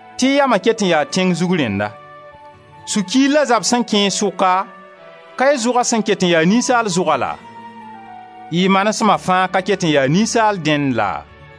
tɩ y yama ket n yaa tẽng zug rẽnna. Sũ-kiir la zab sẽn kẽ y sʋka, ka y zʋga sẽn ket n yaa ninsaal zʋga laa? Y manesma fãa ka ket n ya ninsaal dẽnd laa?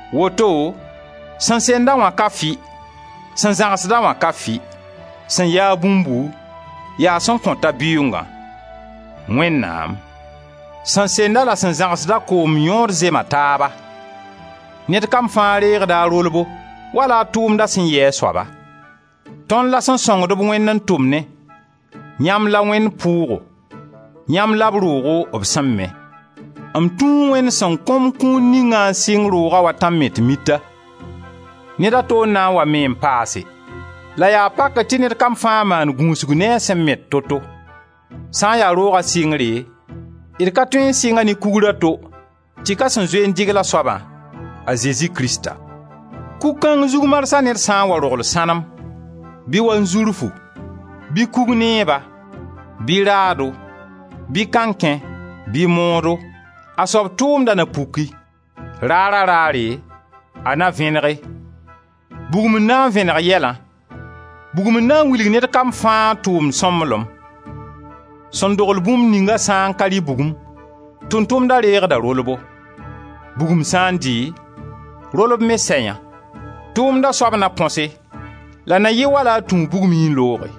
Woto sẽn send-a wã ka fɩ, sẽn zãgsd-a wã ka fɩ, sẽn ya-a bũmbu, yaa sẽn kõta bɩʋʋngã: Wẽnnaam. Sẽn send-a la sẽn zãgsd-a koom yõod zema taaba; ned kam fãa reegda a rolbo, wala a tʋʋmda sẽn yɩ a soaba. Tõnd la sẽn sõngd-b Wẽnd n tʋmnẽ, yãmb la Wẽnd pʋʋgo, yãmb la b roogo b sẽn me. M tũu Wẽnd sẽn kõ-m kũun ningã n sɩng roogã wa tãm-met-mita. Ned a to n na n wa me n paase, la yaa pakr tɩ ned kam fãa maan gũusg ne a sẽn met to-to. Sã n ya rooga sɩngre, d ka tõe n sɩnga ne Kugr a to tɩ ka sẽn zoe n dɩgl a soaba, a Zezi Krista. Kug kãng zug marsã ned sã n wa rogl sãnem, bɩ wanzurfu, bɩ kug nɛɛba, bɩ raado, bɩ kãnkẽ bɩ moodo, a soab tʋʋmda na puki; Raara-raare a na vẽnege: Bugum n na n vẽneg yɛlã, bugum n na n wilg ned kam fãa tʋʋmd sõmblem. Sẽn dogl bũmb ninga sã n ka rɩ bugum, tʋʋm-tʋmda reegda rolbo; Bugum sã n dɩ, rolb me sɛ yã. Tʋʋmda soab na põse la na yɩ wala a tũu bugmẽ n looge.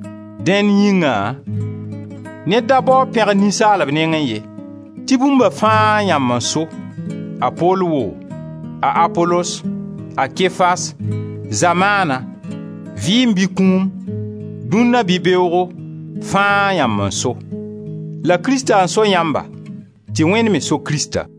Dẽn yĩngã, ned da bao a pẽgr ninsaalb nengẽ ye, tɩ bũmba fãa yãmb n so, a Pol woo, a Apolos, a Kefas, zamaana, vɩɩm bɩ kũum, dũnna bɩ beoogo, fãa yãmb n so; la Krista n so yãmba, tɩ Wẽnd me so Krista.